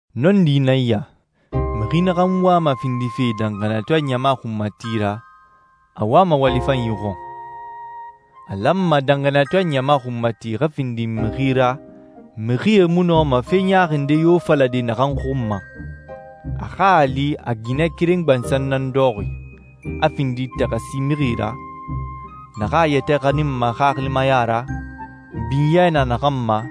Nɔndi nan ya: Mixi naxan wama findife danxaniyatɔɛ ɲama xunmati ra, a wama wali fanyi xɔn. A lanma danxaniyatɔɛ ɲama xunmati xa findi mixi ra mixie mu nɔma fe ɲaaxi nde yo falade naxan xun ma. A xa a li a ginɛ keren gbansan nan dɔxɔxi, a findi taxasi mixi ra, naxan a yɛtɛ xaninma xaxilimaya ra, binyɛ na naxan ma,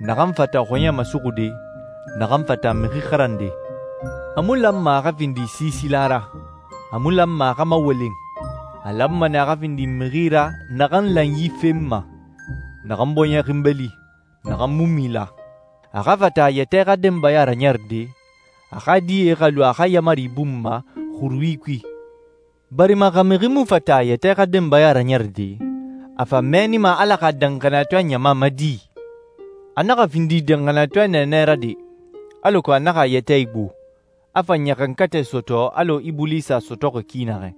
naxan fata xɔɲɛ masuxude, naxan fata mixi xarande. A mu lanma a xa findi siisila ra, a mu lanma a xa mawolen. A lanma nɛ a xa findi mixi ra naxan lanyi fenma, naxan bɔɲɛ xinbeli, naxan mu mila. A xa fata a yɛtɛ xa denbaya raɲɛrɛde, a xa die xa lu a xa yaamari bun ma xurui kui, barima xa mixi mu fata a yɛtɛ xa denbaya raɲɛrɛde, a fa mɛɛnima Ala xa danxaniyatɔɛ ɲama ma di? A naxa findi danxaniyatɔɛ nɛɛnɛ ra de, alako a naxa a yɛtɛ igbo, a fa ɲaxankatɛ sɔtɔ alɔ Ibulisa a sɔtɔxi ki naxɛ.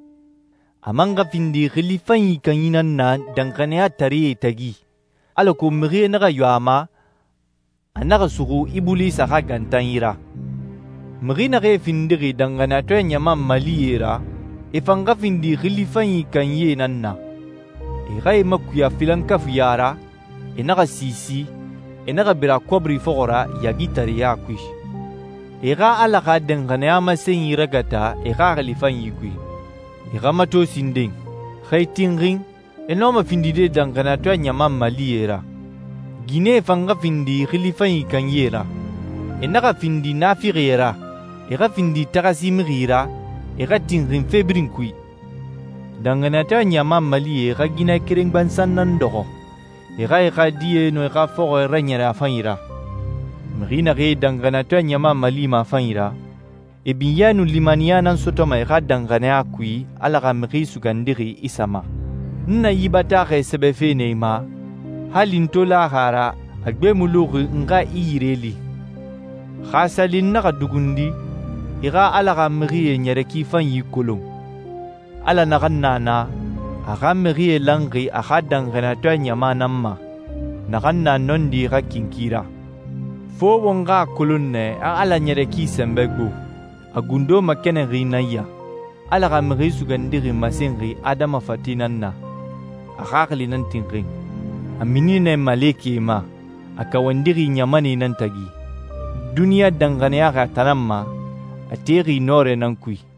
A man xa findi xili fanyi kanyi nan na danxaniyataree tagi, alako mixie naxa yo a ma, a naxa suxu Ibulisa xa gantanyi ra. Mixi naxee findixi danxaniyatɔɛ ɲama malie ra, e fan xa findi xili fanyi kanyie nan na. E xa e makuya filankafuiɲa ra, e naxa siisi, e naxa bira kɔbiri fɔxɔ ra yaagitareya kui. E xa Ala xa danxaniya masenyi ragata e xaxili fanyi kui. E xa mato sinden. Xa e tinxin, e nɔma findide danxaniyatɔɛ ɲama malie ra. Ginɛe fan xa findi xili fanyi kanyie ra. E naxa findi naafixie ra, e xa findi taxasi mixi ra, e xa tinxin fe birin kui. Danxaniyatɔɛ ɲama malie xa ginɛ keren gbansan nan dɔxɔ, e xa e xa die nun e xa fɔxɔɛ raɲɛrɛ a fanyi ra. Mixi naxee danxaniyatɔɛ ɲama malima a fanyi ra, e binyɛ nun limaniya nan sɔtɔma e xa danxaniya kui Ala xa Mixi Sugandixi Isa ma. N na yi bataaxɛ sɛbɛfe nɛ i ma, hali n to laxi a ra a gbe mu luxi n xa i yire li. Xa a sa li n naxa dugundi, i xa Ala xa mixie ɲɛrɛ ki fanyi kolon. Ala naxan na na, a xa mixie lanxi a xa danxaniyatɔɛ ɲama nan ma, naxan na nɔndi xa kinki ra. Fo won xa a kolon nɛ a Ala ɲɛrɛ ki sɛnbɛ gbo. A gundo makɛnɛnxi nan ya: Ala xa Mixi Sugandixi masenxi adama fate nan na, a xaxili nan tinxin. A mini nɛ malekɛe ma, a kawandixi ɲamanɛe nan tagi. Duniɲa danxaniyaxi a tan nan ma, a texi nɔrɛ nan kui.